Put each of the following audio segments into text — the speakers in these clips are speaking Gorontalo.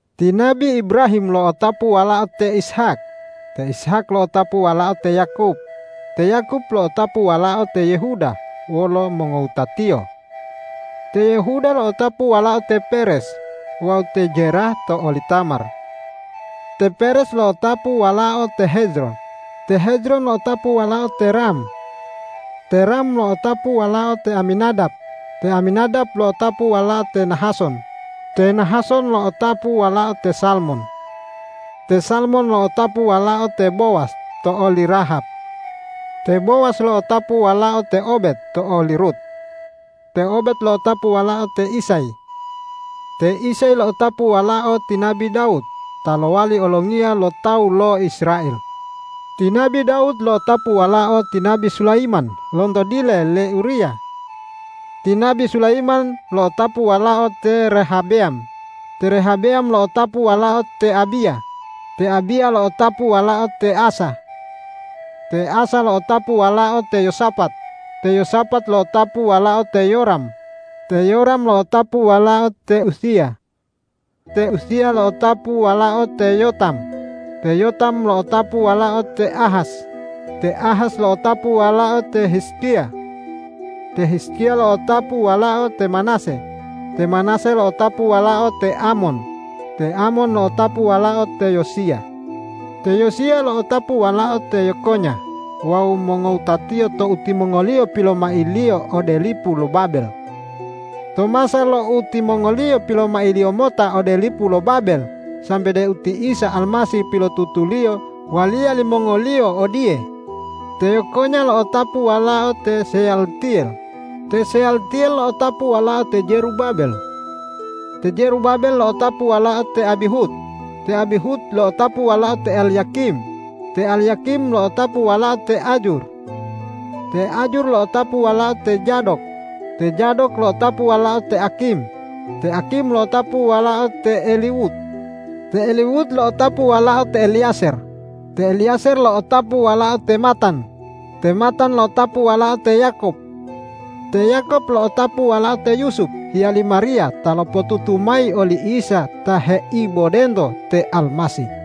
Ti nabi Ibrahim lo'otapu walao te Ishak, te Ishak lo'otapu walao te Yakob, te Yakob lo'otapu walao te Yehuda wolo mongowutatiyo. Te Yehuda lo'otapu walao te Peres wawu te Zerah to oli Tamar. Te Peres lo'otapu walao te Hezron, te Hezron lo'otapu walao te Ram. Te Ram lo'otapu walao te Aminadab, te Aminadab lo'otapu walao te Nahason, te Nahason lo'otapu walao te Salmon. Te Salmon lo'otapu walao te Bowas to oli Rahab. Te Bowas lo'otapu walao te Obed to oli Rut. Te Obed lo'otapu walao te Isay. Te Isay lo'otapu walao ti nabi Dawud ta lowali olongiya lo tawu lo Israel. Ti nabi Dawud lo'otapu walao ti nabi Sulayiman lonto dile le Uriya. Ti nabi Sulayiman lo'otapu walao te Rehabeyam, te Rehabeyam lo'otapu walao te Abiya, te Abiya lo'otapu walao te Asa. Te Asa lo'otapu walao te Yosapat, te Yosapat lo'otapu walao te Yoram, te Yoram lo'otapu walao te Uziya. Te Uziya lo'otapu walao te Yotam, te Yotam lo'otapu walao te Ahas, te Ahas lo'otapu walao te Hizkiya. Te Hizkiya lo'otapu walao te Manase, te Manase lo'otapu walao te Amon, te Amon lo'otapu walao te Yosiya. Te Yosiya lo'otapu walao te Yekonya wawu mongowutatiyo tou timongoliyo pilomailiyo ode lipu lo Babel. To masa lo utimongoliyo pilomailiyo mota ode lipu lo Babel sambe deu ti Isa Almasih pilotutuliyo waliya limongoliyo odiye: Te Yekonya lo'otapu walao te Seyaltiyel, te Seyaltiyel lo'otapu walao te Zerubabel. Te Zerubabel lo'otapu walao te Abihud, te Abihud lo'otapu walao te Elyakim, te Elyakim lo'otapu walao te Azur. Te Azur lo'otapu walao te Zadok, te Zadok lo'otapu walao te Akim, te Akim lo'otapu walao te Eliwud. Te Eliwud lo'otapu walao te Eleyazer, te Eleyazer lo'otapu walao te Matan, te Matan lo'otapu walao te Yakob. Te Yakob lo'otapu walao te Yusup hiyali Mariya ta lopotutu mayi oli Isa ta heibodento te Almasih.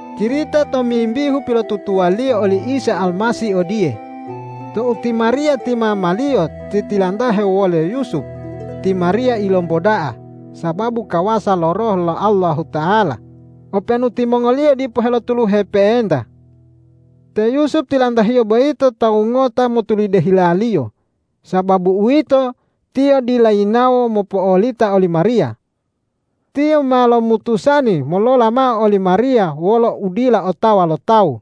Cirita tomimbihu pilotutuwaliyo oli Isa Almasih odiye: Tou ti Mariya ti mama-Liyo titilantahe wole Yusup, ti Mariya ilomboda'a sababu kawasa lo Roh lo Allahuta'ala, openu timongoliyo dipo helotuluhe pe'enta. Te Yusup tilantahiyo boyito tawu ngota motulide hilaliyo. Sababu uwito, tiyo dila yinawo mopo'olita oli Mariya. Tiyo ma lomutusani molola mao oli Mariya wolo udila otawa lo tawu.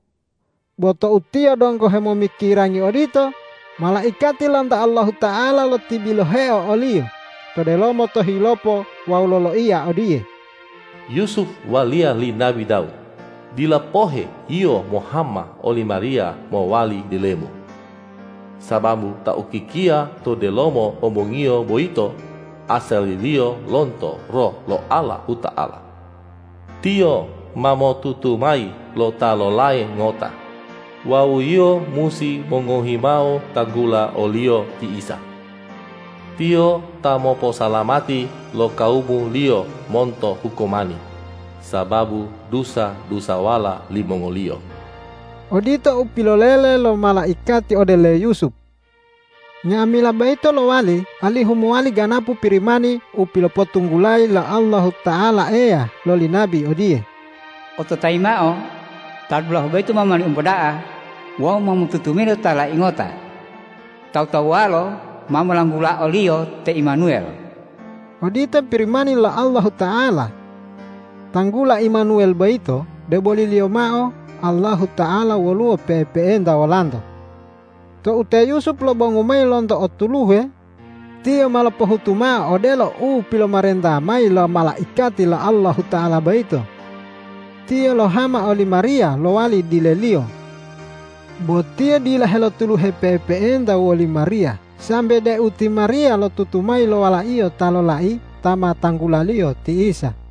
Bo tou tiyo donggo hemomikirangi odito, malaikati lonto Allahuta'ala lotibiloheo oliyo to delomo tohilopo wawu loloiya odiye,”Yusup waliya li nabi Dawud, dila pohe yio mohama oli Mariya mowali dilemu, sababu Ta ukikia to delomo ombongiyo boyito asaliliyo lonto Roh lo Allahuta'ala. Tiyo ma motutu mayi lo ta lolai ngota wawu yio musi mongohi mao tanggula o-Liyo ti Isa. Tiyo ta moposalamati lo kawumu-Liyo monto hukumani sababu dusa-dusawala limongoliyo.” Odito u pilolele lo malaikati ode le Yusup. Nga'amila boyito lowali alihu mowali ganapu Pirimani u pilopotunggulayi lo Allahuta'ala Eya loli nabi odiye, ”Ototayi mao: Ta dulahu boyito ma mowali omboda'a wawu ma motutu mayi lo ta lolai ngota. Tawu-tawuwalo ma molanggula o-Liyo te Imanuwel.” Odito Pirimani lo Allahuta'ala. Tanggula Imanuwel boyito, deboliliyo mao Allahuta'ala woluwo pe'epe'enta wolanto. Tou te Yusup lobongu mayi lonto otuluhe, tiyo ma lopohutu mao odelo u pilomarenta mayi lo malaikati lo Allahuta'ala boyito. Tiyo lohama oli Mariya lowali dileliyo. Bo tiyo dila helotuluhe pe'epe'enta woli Mariya sambe deu ti Mariya lotutu mayi lo walaiyo ta lolai ta ma tanggulaliyo ti Isa.